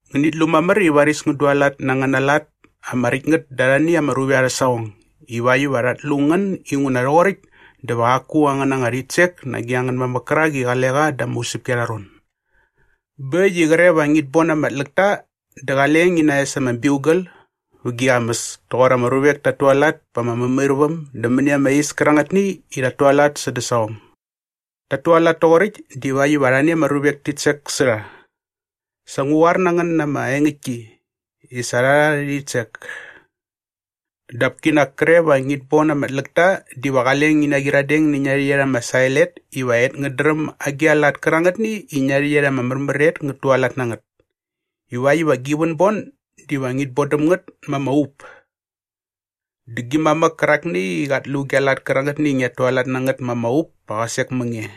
“Ngänit lu mamär i varis ngän dualat na angäna lat ama räkt ngät da arhani ama ruvek arhä saqong ivakt iva rhat lu ngän inguna rhoqoräkt dä va qaku angän anga rhitsek nage angän mamäk kärak i qale qa da ama usäpki arha ron. “Bä äkt i qre va ngit bon ama tläkta dä qale ngi naes ama biugal vä gi qamäs toqor ama ruvek tat tualat pa ama mämairväm dä mäni ama is kärarhani i rhat tualat sädä saqong. Tat tualat toqoräkt divakt iva arhani ama ruvek tit sek sä rha. Sa ngu qoar na ngän na ama engäktki i sa rha rha arhä rhitsek. Dap kinak kre va ngit bon ama tläkta diva qale ngi naqyiradeng nä ngia rhäqyet ama sael et iva et ngät dräm agi a lat kärangätni i ngia rhäqyet ama märmär et et ngät tualat na ngät ivakt iva gi vänbon diva ngit bon däm ngät ma ama up. Dä gi mamäk kärakni i qat lu gia lat kärangätni i ngiat tualat na ngät ma ama up pa qä sek mä nge.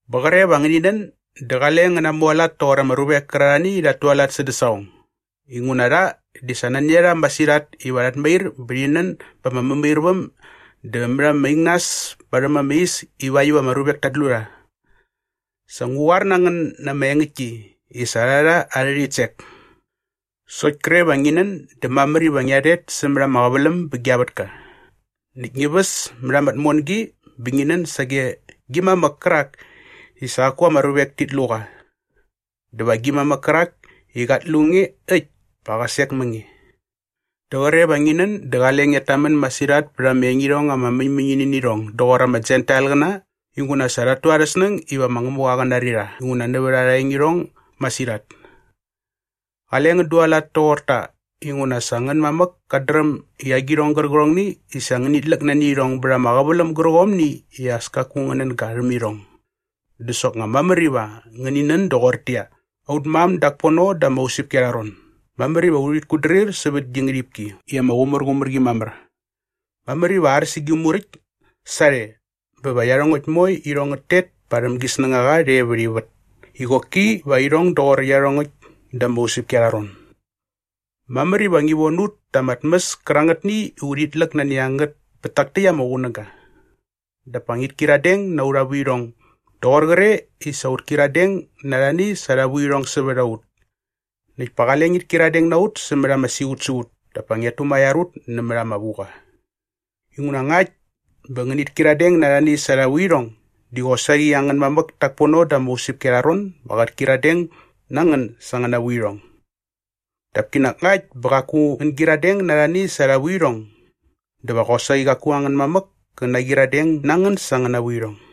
“Bä qre va ngäni nän dä qale ngän namualat toqor ama ruvek kärarhani i rhat tualat sädä saqong. Inguna rha di sa nani a rha masirhat iva rhat mair bä rhi nän ba ama mämairväm dä mät ama ingnas parhäm ama is ivakt iva ama ruvek tat lu rha. Sa ngu qoar na ngän na ama engäktki i sa rha rha arhä rhitsek. “Sokt kre va ngi nän dä mamär iva ngia rhet sämät ama qäväläm bä gia vätka näkt ngi väs mät ama tmongi bä ngi nän sage gi mamäk kärak i sa qaku ama ruvek tit lu qa. Dä va gi mamäk kärak i qat lu nge äkt pa qä sek mä nge. “Dä qre va ngi nän dä qale ngiat tamän masirhat pät ama engirhong ama mäñmäñini nä irhong doqor ama Jentailqäna inguna sa rhat tu arhä snäng iva ma Ngämuqa qä nari rha inguna nävät arha engirhong masirhat. Qale ngän dualat toqor ta inguna sa angän mamäk kat dräm i agirhong gärqärhongni i sa ngänit läk nani irhong bät ama qäväläm gärqomni i as kaku ngän nän ga rhäm irhong. Dä soknga mamär iva ngäni nän doqortäqyia, “Aut mam dak pono da ama usäpki arha ron, mamär iva urhit kutdrir sävät gi ngärhipki i ama qumärqumär qi mamär. Mamär iva ar sä gi muräkt sarhe bä va iarhongäkt moe irhong ngät tet parhäm gi snängaqa rhe vät ivät i qoki va irhong doqor iarhongäkt da ama usäpki arha ron. Mamär iva ngi von ut ta ama tmäs kärangätni i urhit läk nani a ngät pät tak täkt ama qunäga. Dap pa ngit kyiradeng na aurha vuirhong doqor qre i sa ut kyiradeng na arhani sa arha vuirhong sävät a ut. Näkt pa qale ngit kyiradeng na ut sämät ama siqutsiqut dap pa ngiat tumaiar ut nämät ama vuqa. Inguna ngakt bä ngänit kyiradeng na arhani sa arha vuirhong di qosaqi angän mamäk tak pono da ama usäpki arha ron ba qät kyiradeng na ngän sa angäna vuirhong. Dap kinak ngakt bä qaku ngän naqyiradeng na arhani sa arha vuirhong dä va qosaqi qaku angän mamäk kä naqyiradeng na ngän sa angäna vuirhong.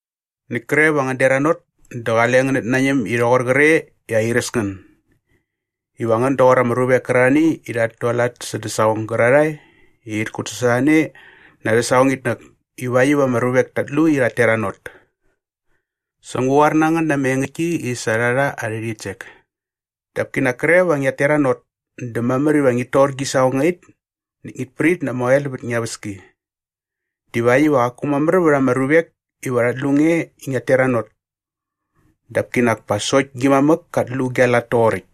“Näkt kre va ngän deranot dä qale ngänät nañäm i rhoqor qre i airäs ngän iva ngän doqor ama ruvek kärarhani i rhat tualat sädä saqong gärarhae i rhit kutsasorhane na arhä saqongitnäk ivakt iva ama ruvek tat lu i rhat teranot. Sa ngu qoar na ngän na ama engäktki i sa rha rha arhä rhitsek. Dap kinak kre va ngiat teranot dä mamär iva ngit tor gi saqongait näkt ngit prit na ama oel vät ngia väski divakt iva qaku mamär vät ama ruvek iva rhat lu nge i ngiat teranot dap kinak pa sokt gi mamäk kat lu gia lat toqoräkt.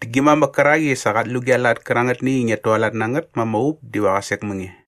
Dä gi mamäk kärak i sa qat lu gia lat kärangätni i ngiat tualat na ngät ma ama up diva qä sek mä nge.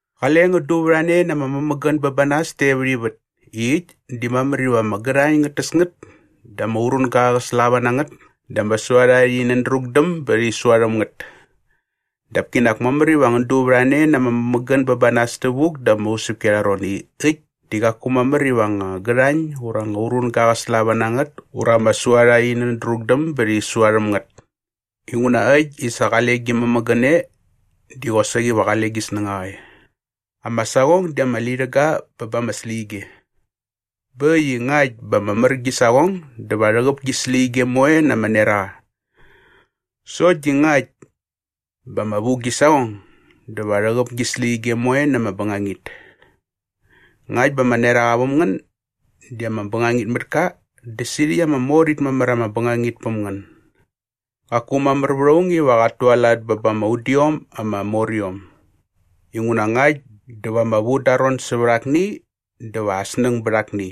“Qale ngän duvärhane na ama mämägän bä ba nas te vät ivät i äkt di mamär iva ama gärhañ ngät täs ngät dä ama urunga qä slava na ngät dä ama suarha rhi nändrukdäm bä rhi sua rhäm ngät. Dap kinak mamär iva ngän duvärhane na ama mämägän bä ba nas tävuk da ama usäpki arha ron i äkt di qaku mamär iva anga gärhañ ura anga urunga ngä naslava na ngät ura ama suarha rhi nändrukdäm bä rhi sua rhäm ngät. Inguna äkt i sa qale gi mämägän e di qosaqi va qale gi snängaqa e. “Ama saqong di ama lirhäga bä ba ama släqyige. Bä äkt i ngakt bä ama mär gi saqong dä va rhäqäp gi släqyige moe na ama neraqa. Sokt di ngakt bä ama vu gi saqong dä va rhäqäp gi släqyige moe na ama bängangit. Ngakt bä ama neraqa väm ngän di ama bängangit mät ka dä sirhäkt ama mor it mamär ama bängangit päm ngän! “Qaku mamär vät aung iva qat tualat bä ba ama udiom ama moriom inguna ngakt dä va ama vu da aa ron sävät akni dä va aa snäng bät akni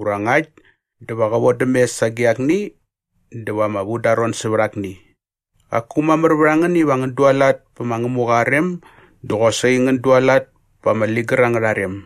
ura ngakt dä va qä vodäm mes sage akni dä va ama vu da aa ron sävät akni. Qaku mamär vät a ngän iva ngän dualat pä ma Ngämuqa aa rem dä qosaqi ngän dualat pa ama ligär angärha rem.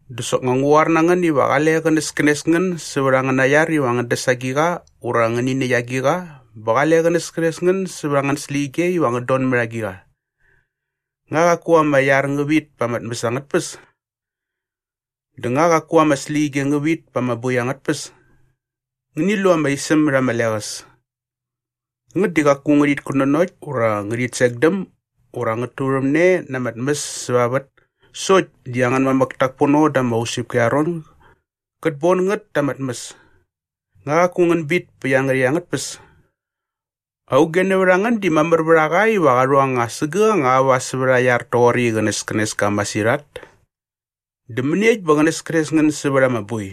“Dä soknga ngu qoar na ngän iva qale qänäskänes ngän sävät angäna iar iva ngän däs agiqa ura va ngäni näkt agiqa bä qale qänäskänes ngän sävät angän släqyige iva ngän don mät agiqa. Nga qaku ama iar ngä vit pa ama tmäs angät tpäs? Dä nga qaku ama släqyige ngä vit pa ama boi angät tpäs? Ngäni lu ama isäm mät ama leqäs. Ngät di qaku ngärhit kutnanokt ura ngärhit sekdäm ura ngät turhämne na ama tmäs säva ama vät sokt di angän mamäk tak pono da ama usäpki arha ron gät bon ngät ta ama tmäs. Nga qaku ngän bit pä iangärhäkt angät tpäs? “Auge nävät a ngän di mamär vät a qa iva qa rhu anga sägäk anga aua sävät aa iar toqoräkt i qänäskänes ka masirhat? Dä mäniekt bä qänäskänes ngän sävät ama boi?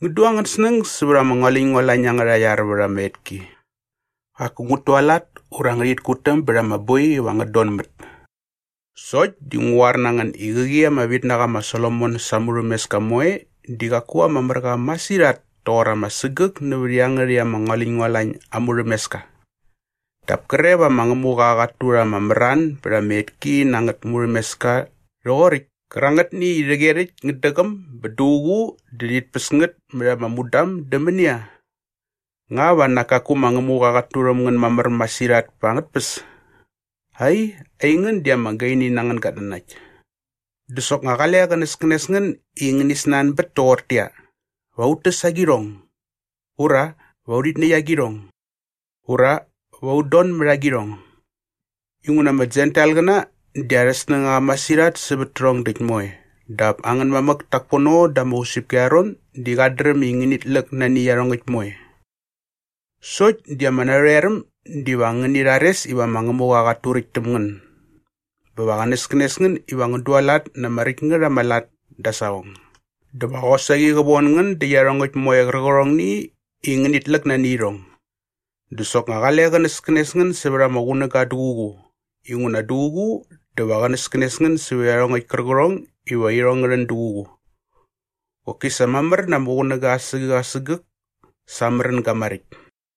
Ngän du angän snäng sävät ama ngualäñngualañ angärha iar vät ama etki. Qaku ngät tualat ura ngärhit kutäm bät ama boi iva ngät donmät sokt di ngu qoar na ngän i qäqi ama vitnaqa ma Solomon sa aa murhämeska moe di qaku ama mär qa masirhat toqor ama sägäk nävät iangärhäkt ama ngualäñngualañ aa murhämeska. Dap kre va ma Ngämuqa qat turha ama mran bät ama etki na angät murhämeska rhoqoräkt kärangätni i rhäqyerhäkt ngät däqäm bä duququ dä rhit päs ngät mät ama mudam dä mänia? Nga va nak kaku ma Ngämuqa qat turhäm ngän mamär masirhat pa angät tpäs? Ai, aingän di ama gaini na angän gatnanakt! “Dä soknga qale qänäskänes ngän i ngäni snanbät toqortäqyia, ‘Va ut täs agirhong?’ ura ‘Va urhit näkt agirhong?’ ura ‘Va ut don mät na agirhong?’ Inguna ama Jentailqäna di arhä snängaqa masirhat sävät tärhong däkt moe dap angän mamäk tak pono da ama usäpki arha ron di qat dräm i ngänit läk nani iarhongäkt moe. Sokt di ama narhoeräm diva ngäni rhares iva ma Ngämuqa qat turäkt täm ngän bä va qänäskänes ngän iva ngän dualat na ama räkt ngät ama lat da aa saqong dä va qosaqi qä von ngän dä iarhongäkt moe qärqärhong i ngänit läk nani irhong. “Dä soknga qale qänäskänes ngän sävät ama qunäga duququ inguna duququ dä va qänäskänes ngän sävät iarhongäkt kärqärhong iva irhong ngä rhän duququ. Qoki sa mamär na ama qunäng asägäk asägäk sa aa märänga maräkt.